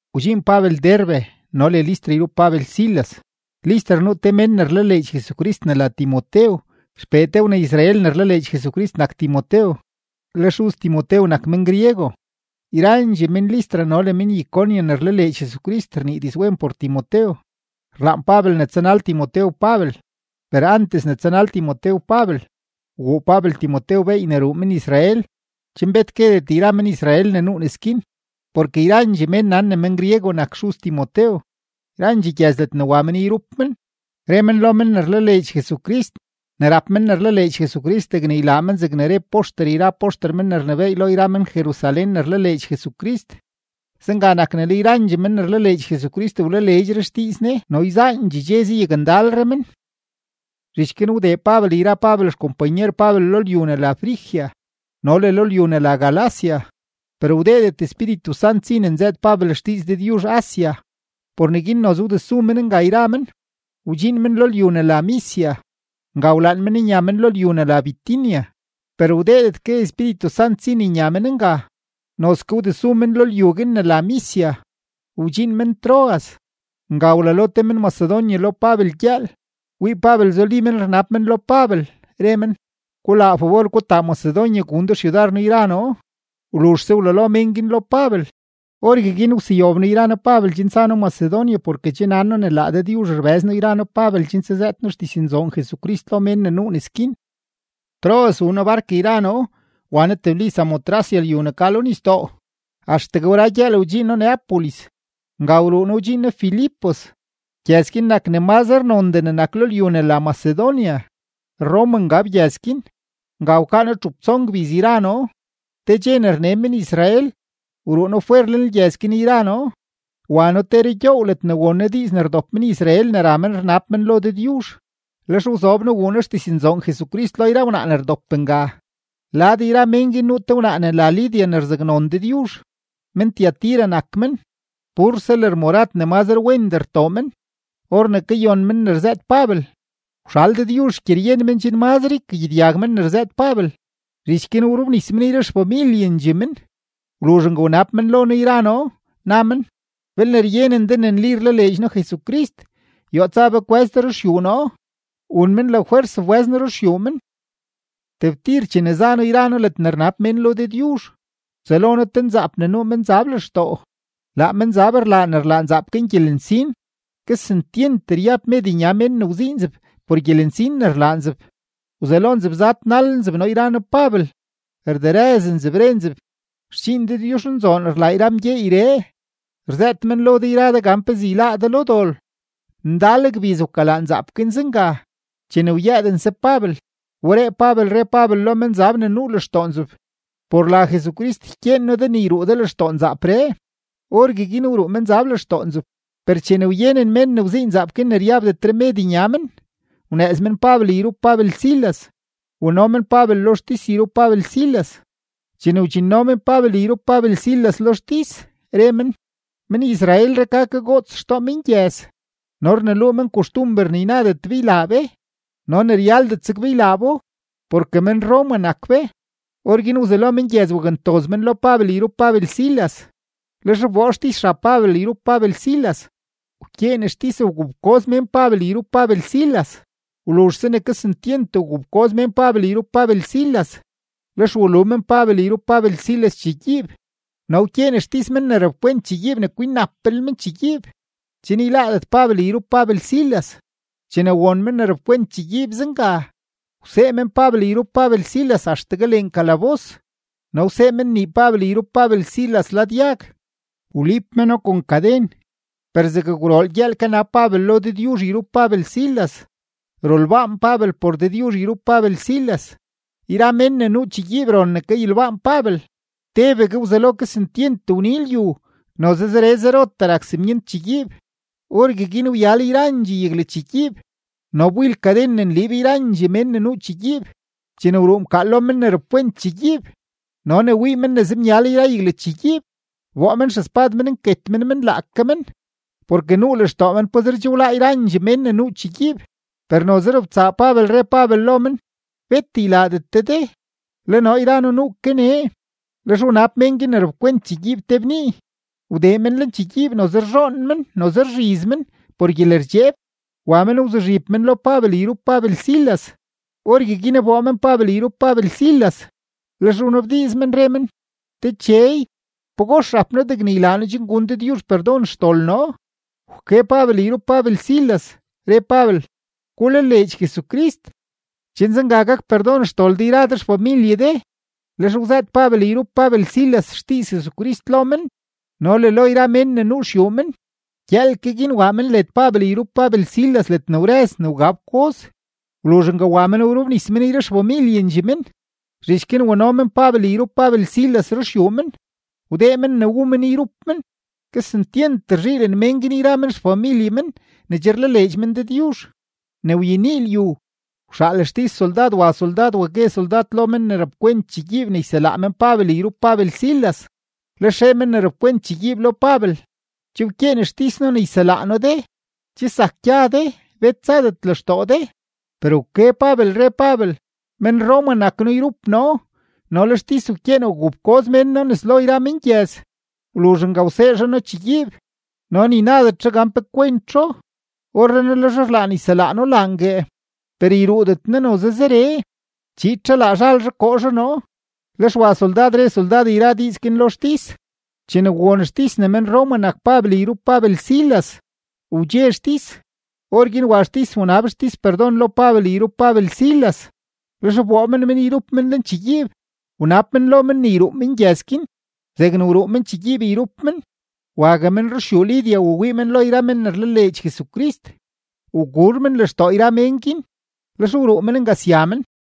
Wdxiin Pabel Derbe no le Listra yrup Pabel Silas. Listra nuu te mén ne rlaleedx Jesucrist ne la Timotew, xpee te wna-Israel ne rlaleedx Jesucrist nak Timotew, le xuz Timotew nak men-griego. Yrandxee men-Listra no le men-Iconio ne rlaleedx Jesucrist rnii dizwen por Timotew. Rlaan Pabel ne tsanal Timotew Pabel, per antes ne tsanal Timotew Pabel, wguu Pabel Timotew beey ne ruu men-Israel, chen bet guedet yra men-Israel ne nuu nes guin, porke yrandxee men nan ne men-griego nak xuz Timotew. Yrandxee gyëz ledne wa men yrup men, re men lo men ne rlaleedx Jesucrist ne rap men ne rlaleedx Jesucrist degne ylaa men zegne re poxter yra poxter men ne rnebééy lo yra men-Jerusalén ne rlaleedx Jesucrist. Zenga nak ne le yrandxee men ne rlaleedx Jesucrist wlaleedxre xdiiz Ne no yzaandxee dxe zayakndalre men. Zhich guin wdee Pabel yra Pabel xkompanyer Pabel lo lyu ne la Frigia no le lo lyu ne la Galacia, per wdeedet Espíritu Sant si ne nzëët Pabel xdiiz Dëdyuzh Asia, por neguin noze wdesu men nga yra men, wdxiin men lo lyu ne la Misia. Nga wlaan men nya men lo lyu ne la Bitinia, per wdeedet ke Espíritu Sant si ne nya men nga. Noze ke wdesu men lo lyu guin ne la Misia, wdxiin men Troas. Nga wlalo te men-Macedonia lo Pabel gyëël, wii Pabel zuli men rnab men lo Pabel, re men: “Gulaa fabor gutaa Macedonia gun de xyudar noo yra noo.” Wluzhse wlalo men guin lo Pabel, orgueguin wseyob noo yra noo Pabel chen tsa noo Macedonia porke che nan noo ne laa Dëdyuzh rbëz noo yra noo Pabel chen tsazëët noo xdiznzoon Jesucrist lo mén ne nuu nes guin. Troas wuu noo bark yra noo, wa noo tebli Samotracia lyu ne ka lo nisdoo; axtegue wra gyëël, wdxiin noo Neápolis. Nga wruu noo wdxiin noo Filipos; gyëz guin nak ne mazre nondee ne nak lo lyu ne la Macedonia. Roma ngab gyëz guin; nga wkaa noo txup tson gbiz yra noo. Te dxe ne rne men-Israel, wruu noo fwer lenlgyëz guin yra noo, wa noo te rugyoow ledne won noo diiz ne rdop men-Israel ne ra men rnab men lo Dëdyuzh. Lex wzob noo wuu noo xdiznzoon Jesucrist lo yra wnaa ne wdop nga. Lad yra men guin nuu te wnaa ne la Lidia ne rzaknon Dëdyuzh; men-Tiatira nak men, purse lërmorad ne mazre wendee rtoo men. Or ne kayon men ne rzëët Pabel, wxal Dëdyuzh xgyeryen men chen mazre ykagyedyag men ne rzëët Pabel. Zhich guin wrobnis men yra xfamilyendxee men. Wluzh nga wnab men lo noo yra noo, na men: ―Belne ryenen de ne nli rlaleedx noo Jesucrist, yoo tsa be kwë́z de ruxyuu noo. Wun men lafwers wbë́z noo ruxyuu men. Tebtir chene za noo yra noo ledne rnab mén lo Dëdyuzh, wtsëlo noo te nzaap ne nuu menzab lextoo. Laa menzab rlaa ne rlaa nzaap guin gyelensin, kesentyent ryab med nya mén ne wzii nzeb por gyelensin ne rlaa nzeb. Wzelo nzeb zadnal nzeb noo yra noo Pabel, rderëz nzeb, re nzeb: ―Xdxiin Dëdyuzhnzoon rlaa yra mgyeeyree, rzëët men lo de yra de gan pezee yláá de lo dol. Ndal gbiz wkalaa nzaap guin zenga. Chene wyëëdense Pabel, wberee Pabel re Pabel lo menzab ne nuu lextoo nzeb: ―Por la Jesucrist ykyeen noo de ne yruu de lextoo nzaapree. Orgueguin wruu menzab lextoo nzeb. Per chene wyenen mén ne wzii nzaap guin ne ryabdetre med nya men, wnëëz men Pabel yrup Pabel Silas, wano men Pabel lo xtis yrup Pabel Silas. Chene wdxinno men Pabel yrup Pabel Silas lo xtis, re men: ―Men-Israelree ka kagoots xtoo mengyëz, no rneluu men koxtumber ne ynadet be ylaa be no ne ryaldet zeg be ylaa bo, porke men-Roma nak be. Orguin wzelo mengyëz wakntoz men lo Pabel yrup Pabel Silas, lex wboo xtis xab Pabel yrup Pabel Silas, wkyeen xtis gufkoz mén Pabel yrup Pabel Silas. Wluzhse ne kesentyent wgufkoz mén Pabel yrup Pabel Silas, lex walu men Pabel yrup Pabel Silas chegyiib, no wkyeen xtis mén ne rapkwent chegyiib ne kwinnaplel men chegyiib, chen yláádet Pabel yrup Pabel Silas. Chene won men ne rapkwent chegyiib zenga, wsee men Pabel yrup Pabel Silas axtegue lenkalabos no wsee men nii Pabel yrup Pabel Silas lad yag, wliib meno kon kaden. Per zeg gwrool gyëël kanab Pabel lo Dëdyuzh yrup Pabel Silas, rolbaan Pabel por Dëdyuzh yrup Pabel Silas; yra mén ne nuu chegyiib ron ne kayolbaan Pabel. Tebegue wzelo kesentyent wni lyu, noze zere zerotee rak simyent chegyiib. Orgueguin wyal yrandxee yaglachegyiib no wbil kaden ne nliib yrandxee mén ne nuu chegyiib. Chene wruu mkaal lo men ne rapkwent chegyiib no ne wii men ne zemyal yra yaglachegyiib, wboo men xespad men nket men men laake men, porke nuu lextoo men pazer che wláá yrandxee mén ne nuu chegyiib. Per noze robtsaa Pabel, re Pabel lo men: ―¡Bet ylaadet de de; le noo yra noo nuu ke nee! Lex wnab mén guin ne rapkwent chegyiib te bnii; wdee men lenchegyiib noze rzhoon men noze rzhiz men por gyelerdxeeb, wa men wzuzhib men lo Pabel yrup Pabel Silas. Orgueguin wboo men Pabel yrup Pabel Silas, lex wnabdiiz men, re men: ―Dechey, ¿pagox rap noo degne ylaa noo chen gun Dëdyuzh perdon xdol noo? Wke Pabel yrup Pabel Silas, re Pabel: ―Gulaleedx Jesucrist, chen zenga gak perdon xdol de yra de xfamilye de. Lex wzëët Pabel yrup Pabel Silas xdiiz Jesucrist lo men no le lo yra mén ne nuu xyuu men. Gyëël ke guin waa men led Pabel yrup Pabel Silas ledne wrëz ne wga fkoz. Wluzh nga wa men wrobnis men yra xfamilyendxee men. Zhich guin wano men Pabel yrup Pabel Silas ruxyuu men, wdee men ne wu men yrup men. Kesentyent rzhiilen mén guin yra men xfamilye men ne che rlaleedx men Dëdyuzh. Ne wyenii lyu, wxaal xtis soldad wa soldad wa gue soldad lo men ne rapkwent chegyiib ne yselaa men Pabel yrup Pabel Silas. Lex re men ne rapkwent chegyiib lo Pabel: ―Che wkyeen xtis noo ne yselaa noo de. Che zak gya de, bet tsadet lextoo de. Per wke Pabel, re Pabel: ―Men-Roma nak noo yrup noo no le xtis wkyeen wgufkoz mén noo nes lo yra mengyëz; wluzh nga wsee zhaa noo chegyiib, no ni nadet zhaa gan pe kwentzho. Orrenaa le zhaa rlaan yselaa noo laangue. ¡Per yruudet noo noze zeree! Chiid zhaa laa zhal zhaa koo zhaa noo. Lex wa soldad re soldad yra diiz guin lo xtis. Chene won xtis ne men-Roma nak Pabel yrup Pabel Silas, wdxe xtis. Orguin wa xtis wnab xtis perdon lo Pabel yrup Pabel Silas, lex wboo men men yrup men lenchegyiib, wnab men lo men ne yruu men gyëz guin. Zegne wruu men chegyiib yrup men, wague men ruxyuu Lidia wawii men lo yra men ne rlaleedx Jesucrist; wguur men lextoo yra mén guin, lex wruu men nga sya men.